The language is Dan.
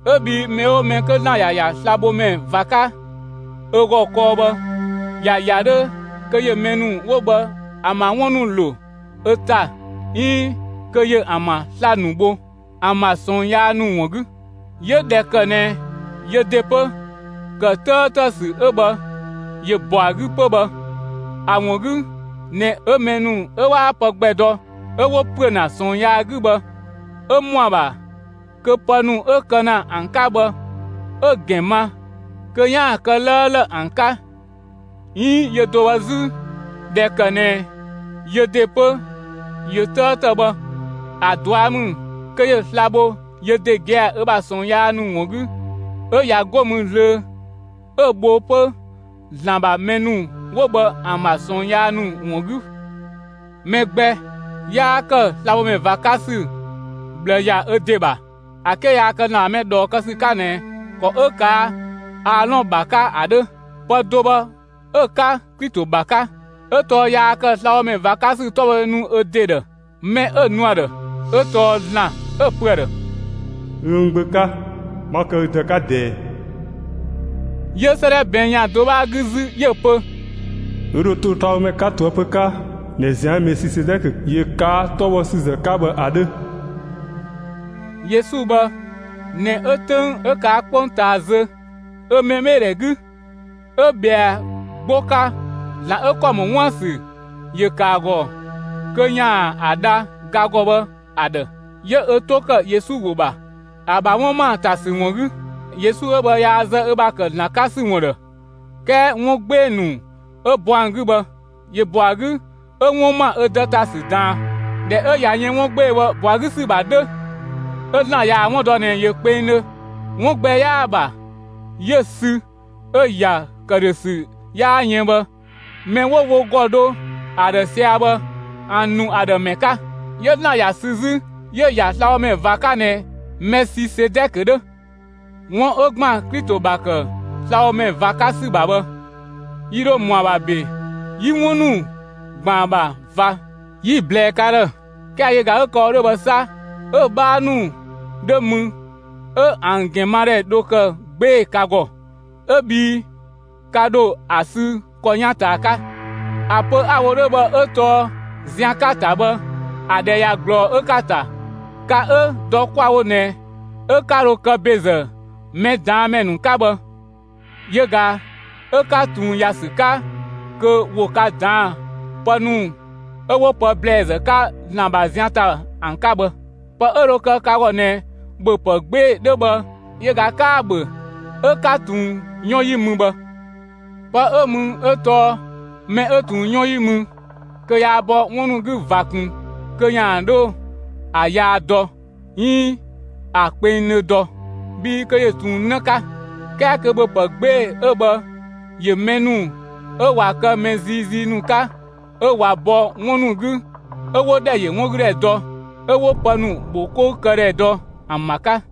'Ö bhii mɛ 'oo mɛ 'kö ‑Zlan ‑ya ‑ya slabhomɛ ꞊va 'ka ö ‑gɔ kɔɔ bhë, ‑ya ‑ya 'dhö kö ‑yö mɛ ‑nu 'wo bhë ‑an ‑bha 'wun ‑nu ‑lo ö ‑ta 'iin kö ‑yö ‑an ‑bha sla‑ ‑nu bho ‑an ‑bha ꞊sɔɔn yaa ‑nu ‑wun 'gü. 'Yö ꞊dhɛ ‑kë ꞊nɛ yö ‑de 'pö, ‑kë 'tëëtë ‑sü 'ö bhë ‑yö ‑bɔ ‑a 'gü 'pö bhë, ‑a ‑wun 'gü ꞊nɛ 'ö mɛ ‑nu 'ö 'waa pë gbɛ dɔ 'ö 'wo ‑püö ‑na ꞊sɔɔn yaa 'gü bhë 'ö ‑mɔ ‑a ‑bha kö pë ‑nu 'ö kë ‑na ‑an 'ka bhë 'ö‑ ‑gɛn ma (kö 'yaan‑ kë 'lëëlë ‑an 'ka), 'iin yö do bhë 'zü, ꞊dhɛ ‑kë ꞊nɛ yö ‑de 'pö ‑yö 'tëëtë bhë, ‑a ꞊dua' ‑mü kö ‑yö sla‑ bho yö ‑de gia‑ ö ‑bha ꞊sɔɔn yaa ‑nu ‑wun 'gü; 'ö ꞊ya 'go mü zlöö 'ö‑ bho 'pö ‑Zlan ‑bha mɛ ‑nu 'wo bhë ‑an ‑bha ꞊sɔɔn yaa ‑nu ‑wun 'gü. Mɛ gbɛ 'yaa ‑kë slabhomɛ ꞊va 'ka ‑sü ꞊bhlë ‑ya ö ‑de ‑bha ‑a 'ke yaa kë ‑Zlan ‑bha mɛ ꞊dhɔɔ kë ‑sü 'ka ꞊nɛ ‑kɔ 'ö ꞊kaa' Aalɔn ‑bha 'ka ‑a 'dhö. Pë do bhë 'ö‑ 'ka Klito ‑bha 'ka. 'Ö tɔɔ yaa ‑kë slabhomɛ ꞊va 'ka ‑sü 'tɔbhɔdhe nu ö ‑de ‑dhë. Mɛ 'ö‑ nu ‑a ‑dhë 'ö tɔɔ ‑Zlan 'ö‑ pö ‑a ‑dhë: Ü n Gbö 'ka, 'ma kë ü Dë 'ka ꞊dɛɛ. 'Yö 'sëëdhɛ ꞊bɛɛn' ‑yan do 'bhaa 'gü 'zü, 'yö‑ pö: Ü ‑dho to slabhomɛ 'ka ꞊toëpö 'ka ꞊nɛ zian 'ö Mɛsisedɛkö ‑yö ꞊kaa' 'tɔbhɔsüzë 'ka bhë ‑a 'dhö. Yesu bhë ꞊nɛ 'ö 'töng 'ö ꞊kaa' 'kpongtaa zö ö mɛbheedhɛ 'gü, 'ö ꞊bhɛa 'gbo 'ka ‑Zlan 'ö ‑kɔ ‑mɔ 'wuën‑ ‑sü ‑yö ‑kë ‑a ‑gɔ kö ‑yaan ‑a dha ga ‑gɔ bhë ‑a ‑dhë. 'Yö ö 'to ‑kë Yesu ‑wo ‑bha, ‑a ‑bha 'wun ‑ma ‑a ‑ta ‑sü ‑wun 'gü. Yesu 'ö bhë yaa zë ö ‑bha ‑kë ‑Zlan Gbö 'ka ‑sü ‑wun ‑dhë, 'kɛɛ 'wun 'gbee‑ ‑nu 'ö bɔ ‑an 'gü bhë, ‑yö ‑bɔ ‑an 'gü 'ö 'wun ‑ma ö Dë ‑ta ‑sü ꞊daan. ꞊Dhɛ 'ö ꞊ya yën 'wun 'gbee‑ bhë ‑bɔ ‑a 'gü ‑sü ‑bha 'dhö, 'ö ‑Zlan ꞊yaa‑ 'wun dɔ ꞊nɛ ‑yö kpengdhö, 'wun gbɛ 'yaa‑ ‑bha, 'yö‑ sü 'ö‑ ‑ya ‑këdhösü 'yaa yën bhë, mɛ 'wo wo ‑gɔ dho ‑a ‑dhë sia‑ bhë, ‑a ‑nu ‑an ‑dhë ‑mɛ 'ka. 'Yö ‑Zlan ‑ya sü 'zü 'yö‑ ‑ya slabhomɛ ꞊va 'ka ꞊nɛ Mɛsisedɛkö 'dhö. 'Wun 'ö ‑gban Klito ‑bha ‑kë slabhomɛ ꞊va 'ka ‑sü ‑bha bhë, yi ‑dho ‑mɔ ‑a ‑bha ‑be 'yi 'wun ‑nu ‑gban ‑a ‑bha ꞊va 'yi‑ ꞊blɛɛ ka ‑dhë; 'kɛɛ yö ꞊ga 'ö kë‑ wo 'dhö bhë 'sa, 'ö‑ 'bhaa ‑nu 'dhö mü 'ö ‑an ‑gɛnmadhɛ dho kë 'gbee‑ ka ‑gɔ 'ö bhii ka ‑dho ‑a sü ‑kɔ 'yan ꞊taa 'ka. ‑A pö 'a‑ wo 'dhö bhë 'ö tɔɔ zian 'ka‑ ‑ta bhë ‑a ‑dhɛ ꞊ya ꞊glɔɔ 'ö 'ka‑ ‑ta. Ka 'ö dɔ 'kwa‑ wo ꞊nɛ 'ö 'ka 'dhö kë ‑bezë mɛ ꞊daan' ‑mɛ ‑nu 'ka bhë, yö ꞊ga 'ö ka ꞊tun ‑ya ‑sü 'ka kö ‑wo ka ꞊daan'‑ pë ‑nu 'ö 'wo pë ‑blɛɛzë 'ka ‑Zlan ‑bha zian ‑ta ‑an 'ka bhë. Pë 'ö dhö kë ka ‑gɔ ꞊nɛ ‑bhöpë 'gbee‑ 'dhö bhë yö ꞊ga 'kaa‑ ‑bhö 'ö 'ka ꞊tun 'yɔn 'yi mü bhë. Pë 'ö mü 'ö tɔɔ mɛ 'ö ꞊tun 'yɔn 'yi mü kö yaa bɔ 'wun ‑nu 'gü ꞊va ꞊kun kö ‑yaan 'dhö ‑a yaa dɔ 'iin ‑a kpengdhö dɔ, bhii kö ‑yö ꞊tun 'në 'ka. 'Kɛɛ kö ‑bhöpë 'gbee‑ 'ö bhë ‑yö mɛ ‑nu 'ö ꞊wa kë mɛ ziizii ‑nu 'ka, 'ö ꞊wa bɔ 'wun ‑nu 'gü, 'ö 'wo ‑dhɛ yö 'wun 'gü ‑dhɛ dɔ, ('ö 'wo pë ‑nu ‑bho 'kou kë ‑dhɛ dɔ) ‑an ‑bha 'ka.